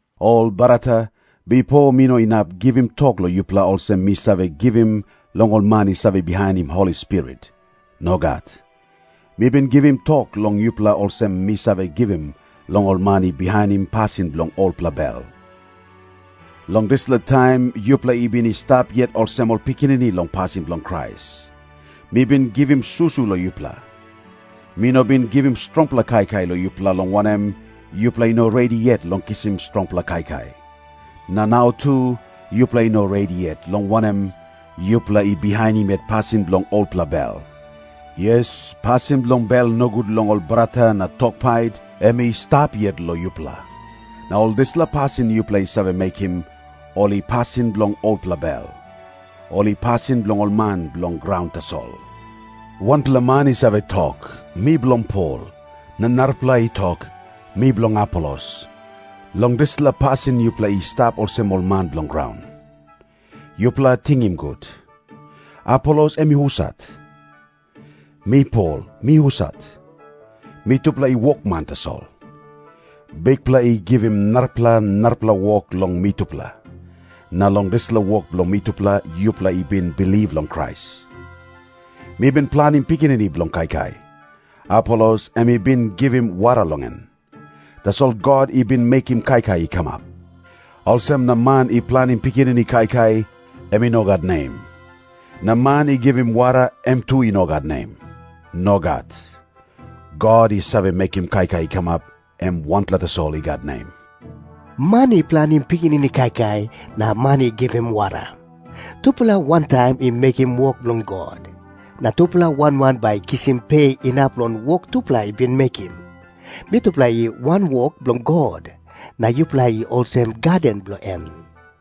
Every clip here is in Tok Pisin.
Ol brata, bipo mi no inap givim tok long yupela olsem mi save givim long ol man i save bihainim Holi Spirit. Nogat. Mi bin givim tok long yupela olsem mi save givim long ol man i bihainim pasin bilong olpela bel. Long dispela taim yupela i bin i stap yet olsem ol pikinini long pasin bilong Krais. Mi bin givim susu long yupela. Mi no bin givim strongpela kaikai long yupela, long wanem, yupela i no redi yet long kisim strongpela kaikai. Na nau tu yupela i no redi yet, long wanem, yupela i bihainim yet pasin bilong olpela bel. Yes, pasin bilong bel nogut long ol brata na tok pait, em i stap yet long yupela. Na ol dispela pasin yupela i save mekim, ol i pasin bilong olpela bel. Ol i pasin bilong ol man bilong graun tasol. Wanpela man i save tok, "Mi bilong Pol." Na narapela i tok, "Mi bilong Apolos." Long dispela pasin yupela i stap olsem ol man bilong graun. Yupela tingim gut. Apolos em i husat? Mi Pol, mi husat? Mitupela i wokman tasol. Bikpela i givim narapela narapela wok long mitupela, na long dispela wok bilong mitupela yupela i bin bilip long Krais. Mi bin planim pikinini bilong kaikai. Apolos em i bin givim wara long en. Tasol God i bin mekim kaikai i kamap. Olsem na man i planim pikinini kaikai, em i no gat nem. Na man i givim wara, em tu i no gat nem. Nogat. God i save mekim kaikai i kamap, em wanpela tasol i gat nem. Man i planim pikinini kaikai na man i givim wara, tupela wantaim i mekim wok bilong God. Na tupela wan wan bai I kisim pe inap long wok tupela i bin mekim. Mitupela i wanwok bilong God, na yupela i olsem gaden bilong en.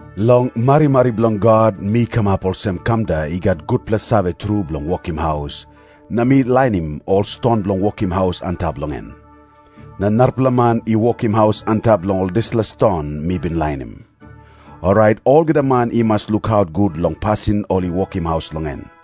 Long marimari bilong God mi kamap olsem kamda i gat gutpela save tru bilong wokim haus, na mi lainim ol ston bilong wokim haus antap long en. Na narapela man i wokim haus antap long ol dispela ston mi bin lainim. Orait olgeta man i mas lukaut gut long pasin ol i wokim haus long en.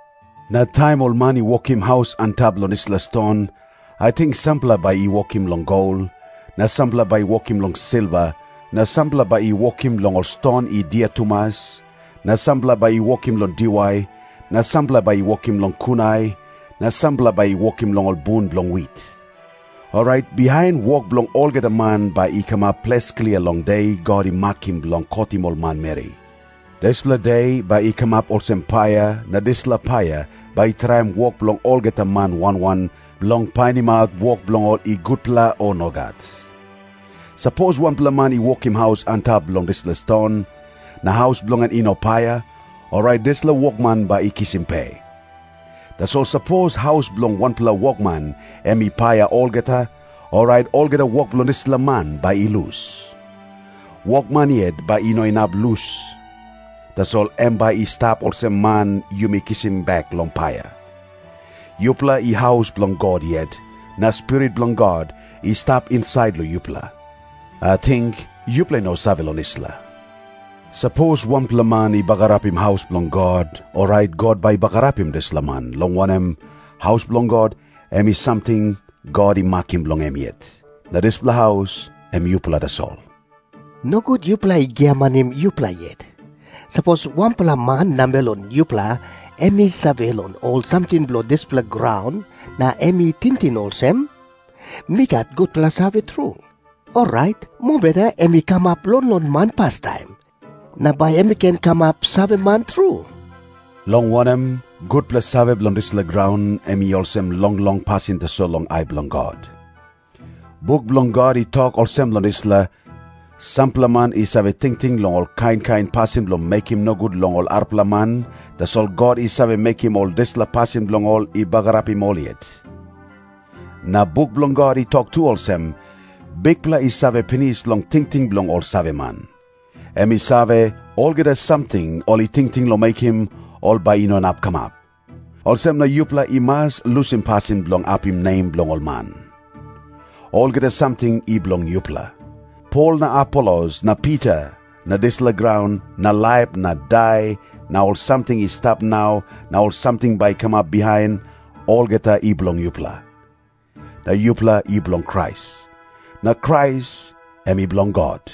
Na taim ol man i wokim haus antap long dispela ston, ating sampela bai i wokim long gol, na sampela bai i wokim long silva, na sampela bai i wokim long ol ston i dia tumas, na sampela bai i wokim long diwai, na sampela bai i wokim long kunai, na sampela bai i wokim long ol bun bilong wit. Orait bihain wok bilong olgeta man bai i kamap ples klia long de God i makim bilong kotim ol manmeri. Dispela de bai i kamap olsem paia, na dispela paia bai i traim wok bilong olgeta man wan wan, bilong painimaut wok bilong ol i gutpela o nogat. Sapos wanpela man i wokim haus antap long dispela ston, na haus bilong en i no paia, orait dispela wokman bai i kisim pe. Tasol sapos haus bilong wanpela wokman em i paia olgeta, orait olgeta wok bilong dispela man bai i lus. Wokman yet bai i no inap lus, tasol em bai i stap olsem man yumi kisim bek long paia. Yupela i haus bilong God yet, na Spirit bilong God i stap insait long yupela. Ating yupela i no save long dispela? Sapos wanpela man i bagarapim haus bilong God, orait God bai i bagarapim dispela man, long wanem, haus bilong God em i samting God i makim bilong em yet. Na dispela haus, em yupela tasol. Nogut yupela i giamanim yupela yet. Sapos wanpela man namel long yupela em i save long ol samting bilong dispela graun na em i tingting olsem, "Mi gat gutpela save tru," orait mobeta em i kamap longlong man pastaim, na bai em i ken kamap saveman tru. Long wanem, gutpela save bilong dispela graun em i olsem longlong pasin tasol long ai bilong God. Buk bilong God i tok olsem long dispela, "Sampela man i save tingting long ol kain kain pasin bilong mekim nogut long ol arapela man, tasol God i save mekim ol dispela pasin bilong ol i bagarapim ol yet." Na buk bilong God i tok tu olsem, "Bikpela i save pinis long tingting bilong ol saveman. Em i save, olgeta samting ol i tingting long mekim, ol bai i no inap kamap." Olsem na yupela i mas lusim pasin bilong apim nem bilong ol man. Olgeta samting i bilong yupela. Pol na Apolos na Pita na dispela graun na laip na dai na ol samting i stap nau na ol samting bai i kamap bihain, olgeta i bilong yupela. Na yupela i bilong Krais. Na Krais em i bilong God.